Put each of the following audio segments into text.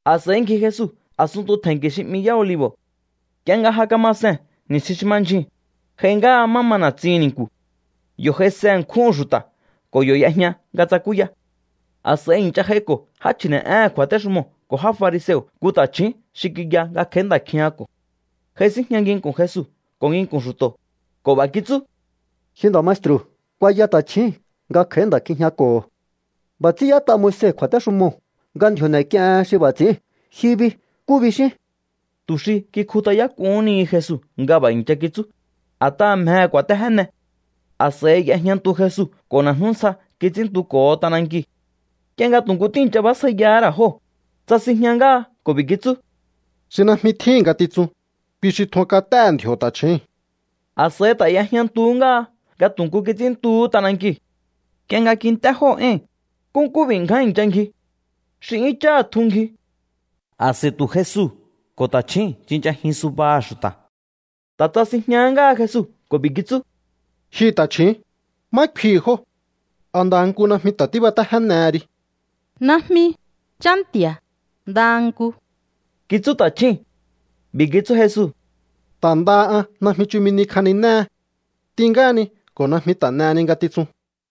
A̱s'a̱i ngji Jesu a̱sunntu tje̱nki̱ xi 'mi Yá Olivo̱. Nk'ie nga ja kama sehe̱n ni̱stjin xi ma ndyjuu̱n, j'ai ngáha má ma na̱tsihi̱n ni̱nku̱. Yo̱ j'aise ṉkjúhu̱n xu̱ta̱ ko̱ yo̱ y'ejña nga tsakúya. A̱s'a̱i i̱ncha j'aiko̱ já chji̱ne̱'éhe̱n kju̱a̱téxumoo̱ ko̱ já fariseo̱ nku ta̱chju̱ún xi kiya nga kj'a̱í nda̱ kjijñako̱ho̱. J'aisínjña nginku̱n Jesu ko̱ nginku̱n xu̱to̱ ko̱ b'a̱ kitsú: —Ji nda̱ maestru̱, kuaya ta̱chjíi̱n nga kj'a̱í nda̱ kjijñako̱ho̱. B'a̱ ts'ín y'ét'a Moise kju̱a̱téxumoo̱ nga ndji̱o̱ n'e̱k'iehen xi b'a̱ ts'i̱íu̱n. Ji bi, ¿nkú bixín? Tu̱ xi kikjut'ayák'uhún ni Jesu nga b'a̱ i̱ncha kitsú, a̱t'aha̱ mjehe̱ ku̱a̱téjéne. A̱s'a̱i y'ejñantu Jesu ko̱ na̱jnú ntsja kits'ínntuko̱ho t'anankiu̱. Nk'ie nga tu̱ nku tíi̱ncha bjásjaiyahá ra̱ jóo̱, tsasinjña ngáha ko̱ b'i̱ kitsú: —Xi najmi tjíhi̱n ngatitsun, kui xi tjun kat'éhe̱ ndji̱o̱ ta̱chjúu̱n. A̱s'a̱i ta̱ y'ejñantuhú ngáha nga tu̱ nku kits'ínntuhú t'anankiu̱. Nk'ie nga kint'é jóo̱ éi̱n, nkúnkú b'i̱ ngján i̱ncha ngji. Xi 'yún cháha̱ tjun ngji. A̱s'a̱i tu̱ Jesu ko̱ ta̱chjúu̱n tsinchajin subaha̱ xu̱ta̱. Ta̱ tsasinjña ngáha Jesu ko̱ b'i̱ kitsú: —Ji ta̱chju̱ún, ¿má kfihi̱ jóo̱? ¿A ndaha nku najmi ta̱ tíbatéjénehe ri? —Najmi, Chá Nti̱a̱. Ndaha nku —kitsú ta̱chjúu̱n. B'i̱ kitsú Jesu: —Ta̱ ndaha an najmi chumi ni kjaninéhe. T'in ngáhani ko̱ najmi ta̱ n'eheni ngatitsun.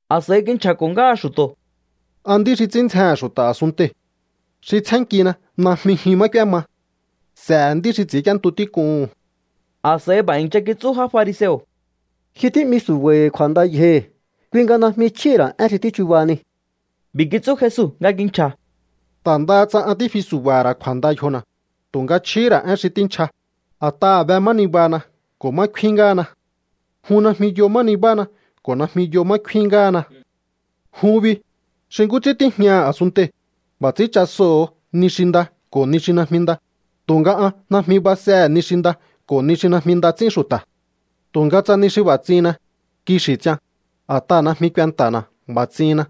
A̱s'a̱i kinchja̱ko̱ ngáha xu̱to̱: —An nd'í xi ts'ín ndzjehe̱n xu̱ta̱ a̱sunntei̱. Xi tsjénnkina najmi jyun má k'úéma. S'e̱he̱ nd'í xi ts'i̱ínk'íéntu tík'uhu̱n. A̱s'a̱i b'a̱ i̱ncha kitsú já fariseo̱: —Ji tí'mi su̱ba̱i̱ kju̱a̱nda yjohi̱. Kui nga najmi chjíhi̱ ra̱ én xi tíchubahani. B'i̱ kitsú Jesu nga kinchja̱: —Ta̱ ndaha tsa an tífi su̱ba̱ha̱ ra̱ kju̱a̱nda yjona̱, tu̱nga chjíhi̱ ra̱ én xi tínchja, a̱t'aha̱ be má nibahana ko̱ má kfín ngáhana. Jun najmi yo má nibáhana ko̱ najmi yo má kfín ngáhana. Jun bi, xi nkú ts'ín tíjñaha̱ a̱sunntei̱, b'a̱ ts'ín chasoho̱o ni xi nda ko̱ ni xi najmi nda, tu̱nga an najmi basjehe̱ ni xi nda ko̱ ni xi najmi nda ts'ín xu̱ta̱. Tu̱nga tsa ni xi b'a̱ ts'ihinna, kixi̱ ts'ian, a̱t'aha̱ najmi kuenta̱na̱ b'a̱ ts'ihinna.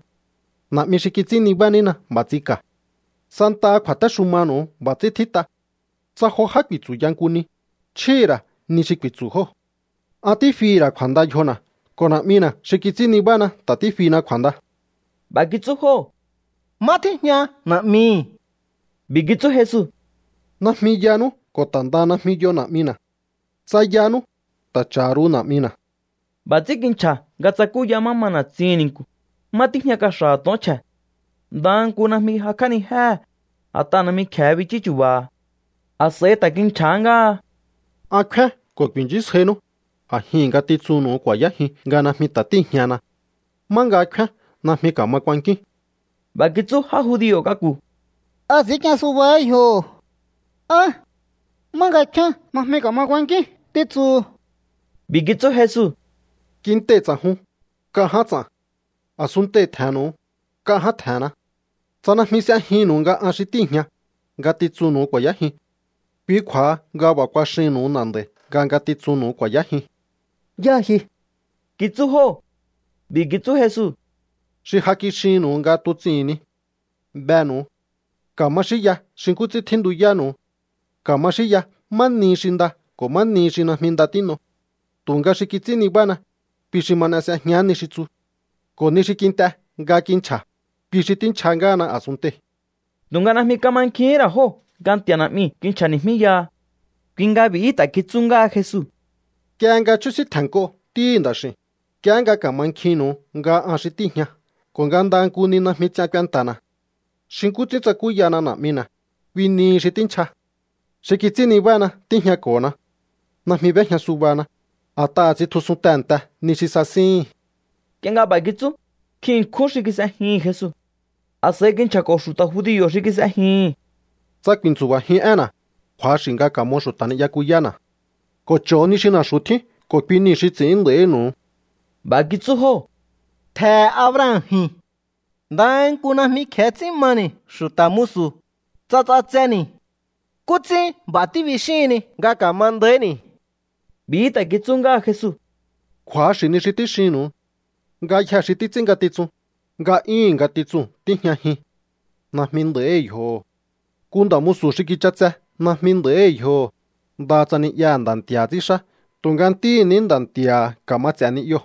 Na̱'mi xi kits'ín nibá nína b'a̱ ts'inka̱. Santaha kju̱a̱téxumanu̱u b'a̱ ts'ín tjít'a: Tsa jo já ku̱i̱tsu̱ya nku ni, chjíhi̱ ra̱ ni xi ku̱i̱tsu̱ jóo̱. An tífihi̱ ra̱ kju̱a̱nda yjona̱ ko̱ Na̱'mina̱ xi kits'ín nibána ta̱ tífina kju̱a̱nda. B'a̱ kitsú jóo̱: —¿Má tíjña Na̱'mihi̱? B'i̱ kitsú Jesu: —Najmi yanú ko̱ ta̱ ndaha najmi yo Na̱'mina̱. Tsa yanú, ta̱ cha̱ ru̱u Na̱'mina̱. B'a̱ ts'ín kinchja̱ nga tsakúya má ma na̱tsihi̱n ni̱nku̱, má tíjña kaxa̱ha̱ to̱on chje̱. Ndaha nku najmi jakj'ánijéhe̱, a̱t'aha̱ najmi kje̱e bichú chu̱ba̱ha̱. A̱s'a̱i ta̱ kinchja̱há ngáha: —An kfíán ko̱ ku̱i̱nchísjainú. A̱jihi̱n ngatitsunnu̱u ku̱a̱yájiun nga najmi ta̱ tíi̱jñahana. Má nga kfíán najmi ka̱ma kuankíún. B'a̱ kitsú já judio̱ k'aku̱: —¿A ts'i̱ínk'ien subahá yjoho̱? ¿Á: “má nga kfíán najmi ka̱ma kuankíún”, títsuhu? B'i̱ kitsú Jesu: —Kintei̱ ts'a̱jun, nk'a ján ts'a̱n. A̱sunntei̱ tje̱he̱nnu̱u, nk'a ján tje̱he̱nna. Tsa najmi s'e̱jinnu̱u nga an xi tíi̱jña, ngatitsunnu̱u ku̱a̱yájiun. Kui kju̱a̱ha nga b'a̱ kuaxihi̱nnu̱u na̱nd'a̱i̱ nga ngatitsunnu̱u ku̱a̱yájiun. —¿Yáha ji? —kitsú jóo̱. B'i̱ kitsú Jesu: —Xi ja kixinnu̱u nga tuts'ihi̱n ni. Benu̱u. Ka̱ma xínya xi nkú ts'ín tjíntuyánu̱u. Ka̱ma xínya má nihi xi nda ko̱ má nihi xi najmi nda tín'o. Tu̱nga xi kits'ín nibána, kui xi ma n'e s'ejián ni xi tsu. Ko̱ ni xi kint'e nga kinchja̱, kui xi tínchja ngáhana a̱sunntei̱. Tu̱nga najmi kamankjihín ra̱ jóo̱ nga Nti̱a̱ Na̱'miu̱ kinchja̱ni̱jmíyaha. Kui nga b'i̱hí ta̱ kitsú ngáha Jesu: —Nk'ie nga chjúsíntje̱nnk'o Ntíhi̱ Nda̱x'i̱u̱n, nk'iehé nga ka̱mankjinnu̱u nga an xi tíi̱jña ko̱ nga ndaha nku ni najmi ts'ian kuenta̱na̱. Xi nkú ts'ín tsakúyana Na̱'mina̱, kui nihi xi tínchja. Xi kits'ín nibána tíjñako̱na. Najmi b'éjña subana, a̱t'aha̱ ts'intjusun tehe̱nte ni xi sasíhi̱n. Nk'ie nga b'a̱ kitsú, nkjin ṉkjún xi kis'ejihi̱n Jesu. A̱s'a̱i kinchja̱ko̱ xu̱ta̱ judio̱ xi kis'ejihi̱n: —Tsa ku̱i̱ntsu̱ba̱jiun énna̱, kju̱axi̱ nga ka̱mo xu̱ta̱ ni'yakuyána̱ ko̱ cho̱o ni xi na̱xu̱ tjín ko̱ kui niu̱ xi ts'i̱ín nda̱ínu̱u. B'a̱ kitsú jóo̱: —Ntje̱he̱ Abraham ji̱n. Ndaha nku najmi kje̱e ts'ín mani̱ xu̱ta̱ musu, tsa ts'atseni̱. ¿Nkú ts'ín b'a̱ tíbixíhinni nga ka̱ma nda̱íhi̱ni̱? B'i̱hí ta̱ kitsú ngáha Jesu: —Kju̱axi̱ ni xi tíxinnu̱u. Ngayjee̱ xi títs'ín ngatitsun, nga'yúhu̱n ngatitsuu̱n tíjñajin. Najmi nda̱íhi̱ yjoho̱. Nku nda̱ musu̱ xi kich'atse najmi nda̱íhi̱ yjoho̱, ndaha tsa ni'yaha̱ nda̱ nti̱a̱ha̱ ts'ínxá. Tu̱nga ntíhi̱ ní nda nti̱a̱ha̱ ka̱ma ts'e̱ ni'yoo̱.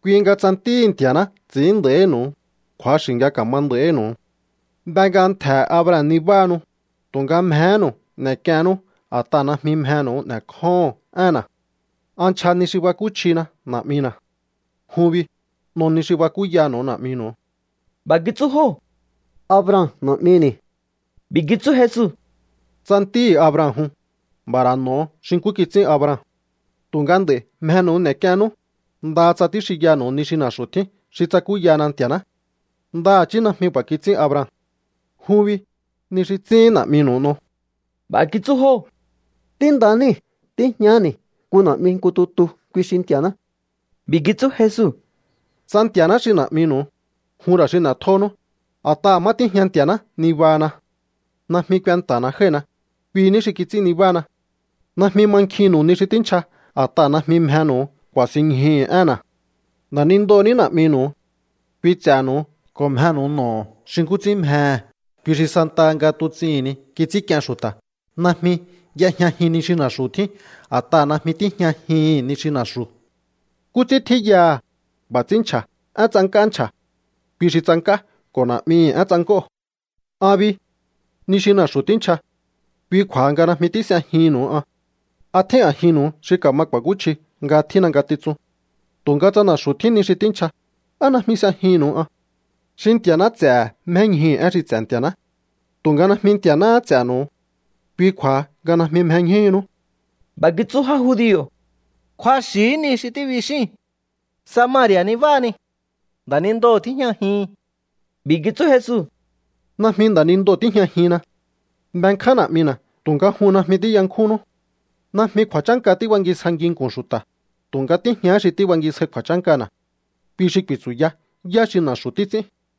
Kui nga tsa Ntíhi̱ Nti̱a̱ná ts'i̱ín nda̱ínu̱u, kju̱axi̱ nga ka̱ma nda̱ínu̱u. Be nga ntje̱he̱ Abraham nibáhanu, tu̱nga mjehénu̱u n'e̱k'iennú a̱t'aha̱ najmi mjenu̱u n'e̱kjóho̱on énna̱. An nchja ni xi bakúchjina Na̱'mina̱. Jun bi, n'o ni xi bakúyanu̱u na̱'minu̱u. B'a̱ kitsú jóo̱: —Abraham na̱'mini̱. B'i̱ kitsú Jesu: —Tsa ntíhi̱ Abraham jun, b'a̱ ra̱ n'o̱o xi nkú kits'ín Abraham. Tu̱nga nd'a̱i̱ mjenu̱u n'e̱k'iennú, ndaha tsa tíxinyanu̱u ni xi na̱xu̱ tjín xi tsakúyana Nti̱a̱ná. Ndaha̱chí najmi b'a̱ kits'ín Abraham. Jun bi, ni xi ts'íhín na̱'minu̱u n'o. B'a̱ kitsú jóo̱: —Ntí nda níi̱. Tíjñaháni̱ nku na̱'mi nku tutu. Kui xi Nti̱a̱ná. B'i̱ kitsú Jesu: —Tsa Nti̱a̱ná xi na̱'minu̱u, jun ra̱ xi n'e̱tjónú, a̱t'aha̱ má tíjña Nti̱a̱ná nibahana. Najmi kuenta̱na̱ jái̱hina. Kui ní xi kits'ín nibána. Najmi mankjinnu̱u ni xi tínchja a̱t'aha̱ najmi mjenu̱u ku̱a̱sinñjuhu̱u énna̱. Nda̱nindoo̱ ní na̱'minu̱u. Kui ts'e̱nu̱u ko̱ mjenu̱u n'o̱o xi nkú ts'ín mjehe̱. Kui xi santaha nga tuts'ihi̱n ni kits'ínk'ien xu̱ta̱. Najmi y'ejñajin ni xi na̱xu̱ tjín, a̱t'aha̱ najmi tíjñajihi̱n ni xi na̱xu̱. Nkú ts'ín tjíyaha̱, b'a̱ ts'ín nchja̱. Én tsank'á nchja̱. Kui xi tsank'á ko̱ na̱'mihi̱ én tsank'óo̱. ’An bi, ni xi na̱xu̱ tínchja. Kui kju̱a̱ha nga najmi tís'ejihi̱nnu̱u an. ¿A tjín a̱jinnu̱u xi ka̱ma ku̱a̱kúchji nga tjínna ngatitsun? Tu̱nga tsa na̱xu̱ tjín ni xi tínchja, ¿á najmi s'ejihi̱nnu̱u an? Xi Nti̱a̱ná ts'e̱he̱ mjéñjuhu̱ én xi ts'e̱ Nti̱a̱ná. Tu̱nga najmi Nti̱a̱náhá ts'e̱nu̱u. Kui kju̱a̱ha nga najmi mjeñjúhunú. B'a̱ kitsú já judio̱: —Kju̱axi̱hí ni xi tíbixíi̱n. Samari̱a̱ nibáhani. Nda̱nindoo̱ tíjñajihin. B'i̱ kitsú Jesu: —Najmi nda̱nindoo̱ tíjñajinna. Benkján Na̱'mina̱ tu̱nga jun najmi tíyankjúnnú. Najmi kju̱a̱chánka tíbangisja nginku̱n xu̱ta̱, tu̱nga tíjñahá xi tíbangisjai kju̱a̱chánkana̱. Kui xi ku̱i̱tsu̱ya yá xi na̱xu̱ títs'ín.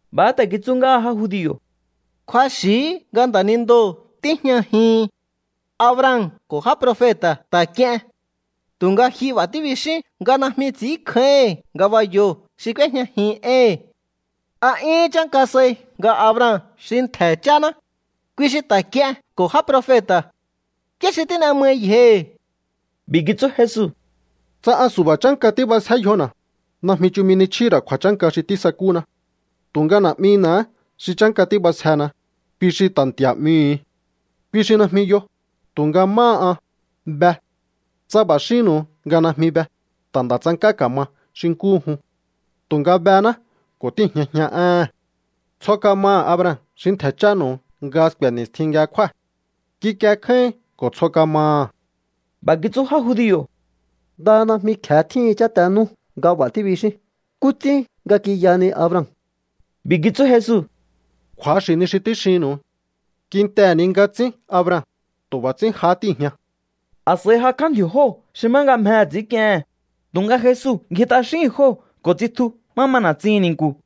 B'a̱há ta̱ kitsú ngáha já judio̱: —Kju̱axi̱hí nga nda̱nindoo̱ tíjñajihin. Abraham ko̱ já profeta̱ ta̱ k'ien. Tu̱nga ji b'a̱ tíbixín nga najmi ts'i̱ínkjáíhi̱n ngabayoo̱ xi k'úéjñajin éhi̱n. ¿A 'yún chánka sai nga Abraham xi ntje̱ cháná? Kui xi ta̱ k'ien ko̱ já profeta̱. ¿Yá xi tín'e mai yjohi̱? B'i̱ kitsú Jesu: —Tsa an su̱ba̱ chánka tíb'asje yjona̱, najmi chumi ni chjíhi̱ ra̱ kju̱a̱chánka xi tísakúna. Tu̱nga Na̱'mina̱há xi chánka tíb'asjena, kui xi ta̱ Nti̱a̱ 'mihu̱u. Kui xi najmi yo, tu̱nga máha an, be. Tsa b'a̱ xínnu̱u nga najmi be, ta̱ nda̱ tsank'á ka̱ma xi nkúhu jun. Tu̱nga bená ko̱ tíi̱jñajian éhe̱n. Tsjo kamaha̱ Abraham xi ntje̱ chánu̱u nga sku̱e̱ ni̱stjin nga kjúa̱. Kikie kjáíhin ko̱ tsjo kamaha̱. B'a̱ kitsú já judio̱: —Ndaha najmi kje̱e tjíhin cháte nú nga b'a̱ tíbixín. ¿Nkú ts'ín nga kiyahani Abraham? B'i̱ kitsú Jesu: —Kju̱axi̱ ni xi tíxinnu̱u. Kintehe̱ ni nga tsín Abraham, tu̱ b'a̱ ts'ín jahá tíi̱jña. A̱s'a̱i jakj'á ndji̱o̱ jóo̱ xi má nga mjehe̱ ts'i̱ínk'iehe̱n, tu̱nga Jesu ngji t'axíhi̱n jóo̱ ko̱ tsitju má ma na̱tsihi̱n ni̱nku̱.